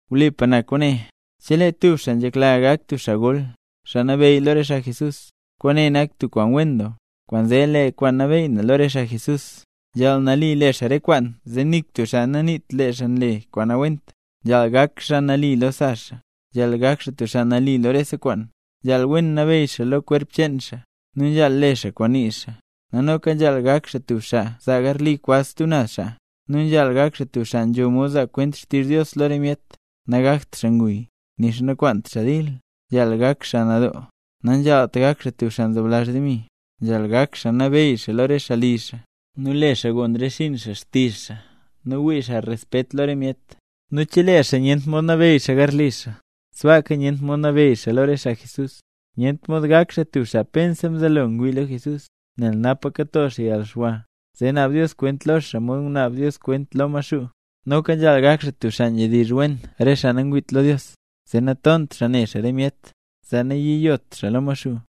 Wlipa na kwaane, chelee tub xaa nzhekla gak xaa tub xaa gol, xaa nabeyy lo re xaa Jesús, kwaane nak tub kwaan wen doo. Kwaanzee lee xaa kwaan nabeyy lo re xaa Jesús nzhaal nali le xaa re kwaan zee nik tub xaa naniit lee xaa nle kwaan nawent, nzhaal gak xaa nali lo sa xaa, nzhaal gak xaa tub xaa nali lo rese kwaan, nzhaal wen nabeyy xaa lo kwerp cheen xaa, nu nzhaal le xaa kwaan nii xaa. Nu noka nzhaal gak xaa tub xaa zaa garli kwaz stub naz xaa, nu nzhaal gak xaa tub xaa nzho mod zaa kwent xtizh Dios lo re myet. Nagakt xaa nguy, nixa nakwaant xaa dil, nzhaal gak xaa nadoo, nanzhaalt gak xaa tub xaa nzoblazh demi. Nzhaal nabeyy xaa lo re xaa li xaa, nu le xaa gon re xinn xaa xtizh xaa, nu wii xaa respet lo re myet. Nu chelee xaa nyent mod nabeyy xaa garli xaa, sbaaka nyent mod nabeyy xaa lo re xaa Jesús. Nyent mod gak xaa tub xaa pensa mzelo ngwii lo Jesús, nel napa kato xaa yalxwa, zee naab Dios kwent lo xaa mod ngunaab xaaya kwent lo Maxuu. Noka nzhaal gak xaa tub xaa nzhedizh wen re xaa nangwiit lo Dios, zee natont xaa ne xaa re myet, zee nayiyot xaa lo Maxuu.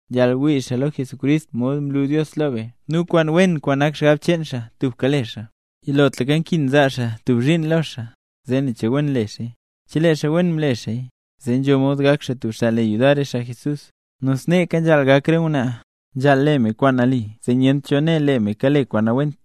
Nzhaal wii xaa lo Jesucrist mod mlu Dios lo be nu kwaan nak xgab cheen xaa tubka le xaa kwaan wen. Yilotlaka nkin zaa xaa tub zhiin lo xaa zee nen che wen le xaaya. Chelee xaa wen mle xaaya, zee nzho mod gak xaa tub xaa le yudar re xaa Jesús. Nu sneeka nzhaal gak re ngwnaa: nzhaal le me kwaan nali zee nyent cho né lee me kale kwaan nawent,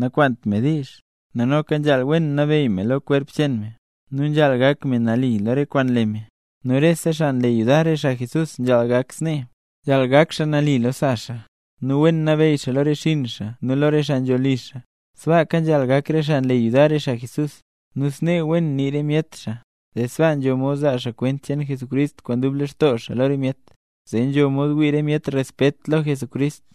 nakwaant me diizh, nu noka nzhaal wen nabeyy me lo kwerp cheen me, nu nzhaal gak me nali lo re kwaan nle me. Nu rese xaa nle yudar re xaa Jesús nzhaal gak snee: nzhaal gak xaa nali lo sa xaa, nu wen nabeyy xaa lo re xinn xaa nu lo re xaa nzho li xaa. Sbaaka nzhaal gak re xaa nle yudar re xaa Jesús, nu snee wen nii re myet xaa, zee sbaa nzho mod zaa xaa kwent cheen Jesucrist kwaan dub lextoo xaa lo re myet, zee nzho mod wii re myet respet lo Jesucrist.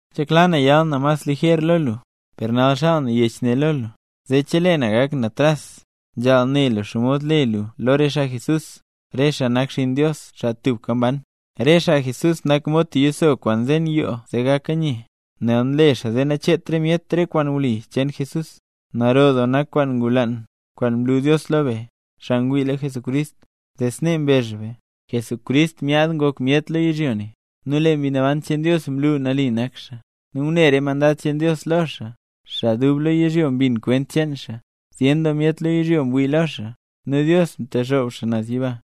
Nzhekla na yal na mas lijer lo lu, per nal xaal na yech ne lo lu, zee chelee na gak na tras, nzhaal ne lu xomod le lu lo re xaa Jesús, re xaa nak xinn Dios, xaa tubka mban. Lee re xaa Jesús nak mod tub yiso kwaan nzen yoo zee gaka nye, nel nle xaa zee nacheet re myet re kwaan wli cheen Jesús. ¡Naro doo nak kwaan ngulaan, kwaan mlu Dios lo be, xaa ngwii lo Jesucrist! Zee snee mbezh be: Jesucrist myaad ngok xaa myet lo yizhyo, nu lee Mbi Naban cheen Dios mlu nali nak xaa, nu ngune re mandad cheen Dios lo xaa. Xaa dub lo yizhyo mbin kwent cheen xaa. Zyen doo myet lo yizhyo mwii lo xaa. Nu Dios mtexoob xaa naz yiba.